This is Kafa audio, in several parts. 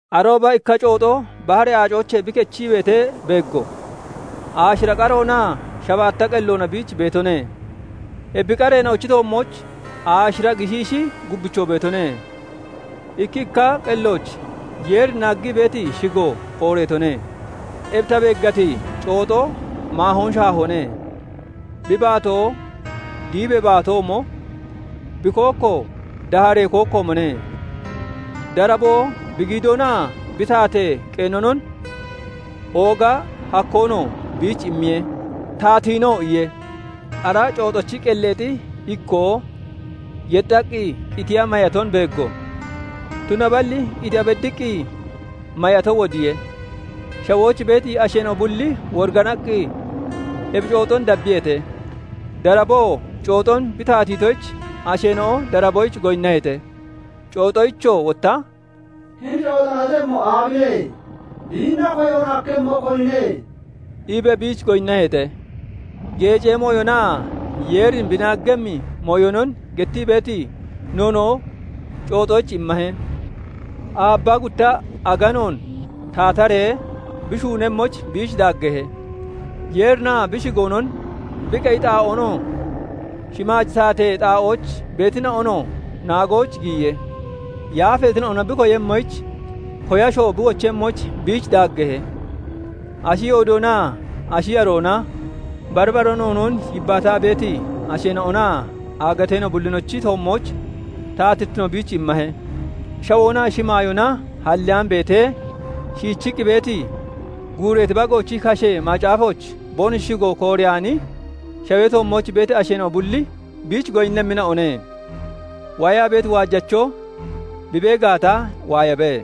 Arooba ikka cooxo baharee aacoochee bi kechii beetee beeggo; aashira qaroonaa shabaatta qelloona biich beetone; ebi qareena'ochi toommooch aashira gishiishi gubbichoo beetone; ikki ikka qellooch Yeerin naaggii beeti shigo kooreetone. Ebi ta beeggati cooxo maahoon shaahoone; bi baatoo diibee baatoomo, bi kookkoo daaharee kookkoomone; daraboo bi giidoonaa bi taatee qeenonon, ooga hakkoonoo biich immiye; taatiinoo iye. Ara cooxochi qelleexi ikkoo yexxaqqi qitiya mayaton beeggo; tunaballi qitiya beddiqqi mayato wodiye. Shawooch beeti asheena'o bulli woriganaqqi ebi cooxon dabbiyeete. Daraboo cooxon bi taatiitoyich asheena'o daraboyich goyinnaheete; cooxoyichoo wotta "Hini cooxona tatemmo aabine? Biinna koyoon hakkemmo, konine?" iibee biich goyinnaheete. Geecee mooyonaa Yeerin bi naaggemmi mooyonon gettii beeti noonoo cooxoyich immahe; aabbaa gutta aganoon taataree bi shuunemmoyich biich daaggeehe. Yeerinaa bi shigoonon, bi qeyi xaa'oonoo, shimaaji taatee xaa'ooch beetina'onoo naagooch giyiye; yaafeetina'ona bi koyemmoyich, koyashoo bi wochemmoyich biich daaggeehe; ashi yoodoonaa ashi yaroona, bari bara noonoon yibbaataa beeti asheena'onaa aagateena'o bullinochi toommooch taatittino biich immahe. Shawoonaa shimaayoona halleyaan beetee shiichiqqi beeti, guureeti Bagoochi kashee macaafooch boonoshi shigo kooreyaani, shawee toommooch beeti asheena'o bulli biich goyinnemmina'one. Waayaa beeti waajacho bi bee gaata, waayabe.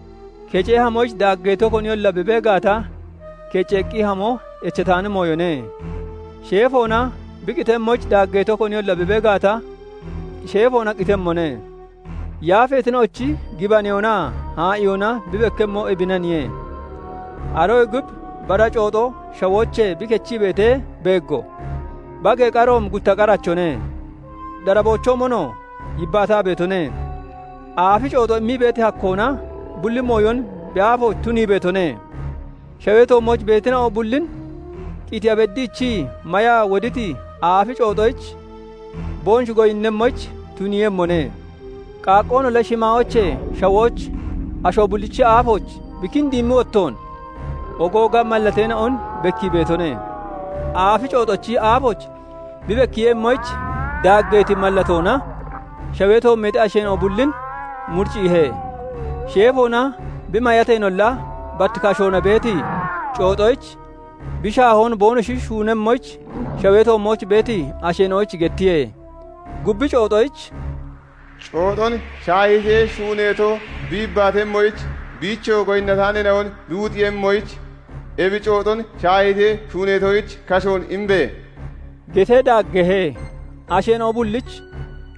Kecee hamoyich daaggeeto koniyolla bi bee gaata, kecceeqqi hamo echataani mooyone; sheefoona bi qitemmoyich daaggeeto koniyolla bi bee gaata, sheefoona qitemmone. Yaafeetina'ochi gibaneyoonaa haa'iyoona bi bekkemmo ebinaniye. Aroyee gub bara cooxo shawoochee bi kechii beetee beeggo; bagee qaroomi gutta qarachone; daraboochoomonoo yibbaataa beetone. Aafi cooxo immiti hakkoona bulli mooyon bi aafooch tunii beetone. Shawee toommooch beetina'o bullin qitiya beddiichii mayaa woditi aafi cooxoyich boonoshi goyinnemmoyich tuniiyemmone. Qaaqqoonolla shimaayoochee shawooch asho bullichi aafooch bi kindiimmi wottoon ogooga mallateena'on bekkii beetone. Aafi cooxochi aafooch bi bekkiiyemmoyich daaggeeti mallatoona shawee toommeexi asheena'o bullin muricciihe; sheefoona bi mayateenolla, bat kashoona beeti cooxoyich bi shaahiyoon boonoshi shuunemmoyich shawee toommooch beeti asheena'oyich gettiye. Gubbi cooxoyich "Cooxon shaahiitee shuuneeto bi yibbaatemmoyich, biichoo goyinnataaneena'on bi wuxiiyemmoyich, ebi cooxon shaahiitee shuuneetoyich kashoon imbe!" getee daaggeehe. Asheena'o bullich,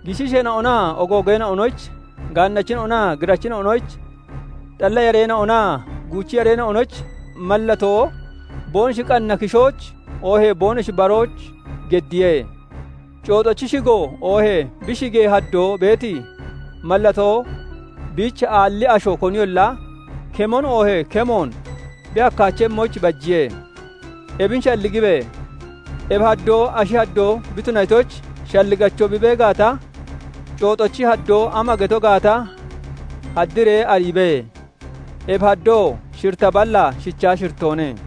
gishiisheena'onaa ogoogeena'onoyich, gaannachina'onaa girachina'onoyich, xalla yareena'onaa guuchi yareena'onoyich mallatoo boonoshi qanna kishooch oohee boonoshi barooch geddiye; Cooxochi shigo oohee bi shigee haddoo beeti mallatoo biich aalli asho koniyolla kemon oohee kemoon bi hakkaachemmoyich bajiye. Ebin shalligibe! Ebi haddoo ashi haddoo bi tunatoyich, shalligacho bi bee gaata, cooxochi haddoo ama geto gaata haddiree ariibe; ebi haddoo shiritta ballaa shichaa shirittoone.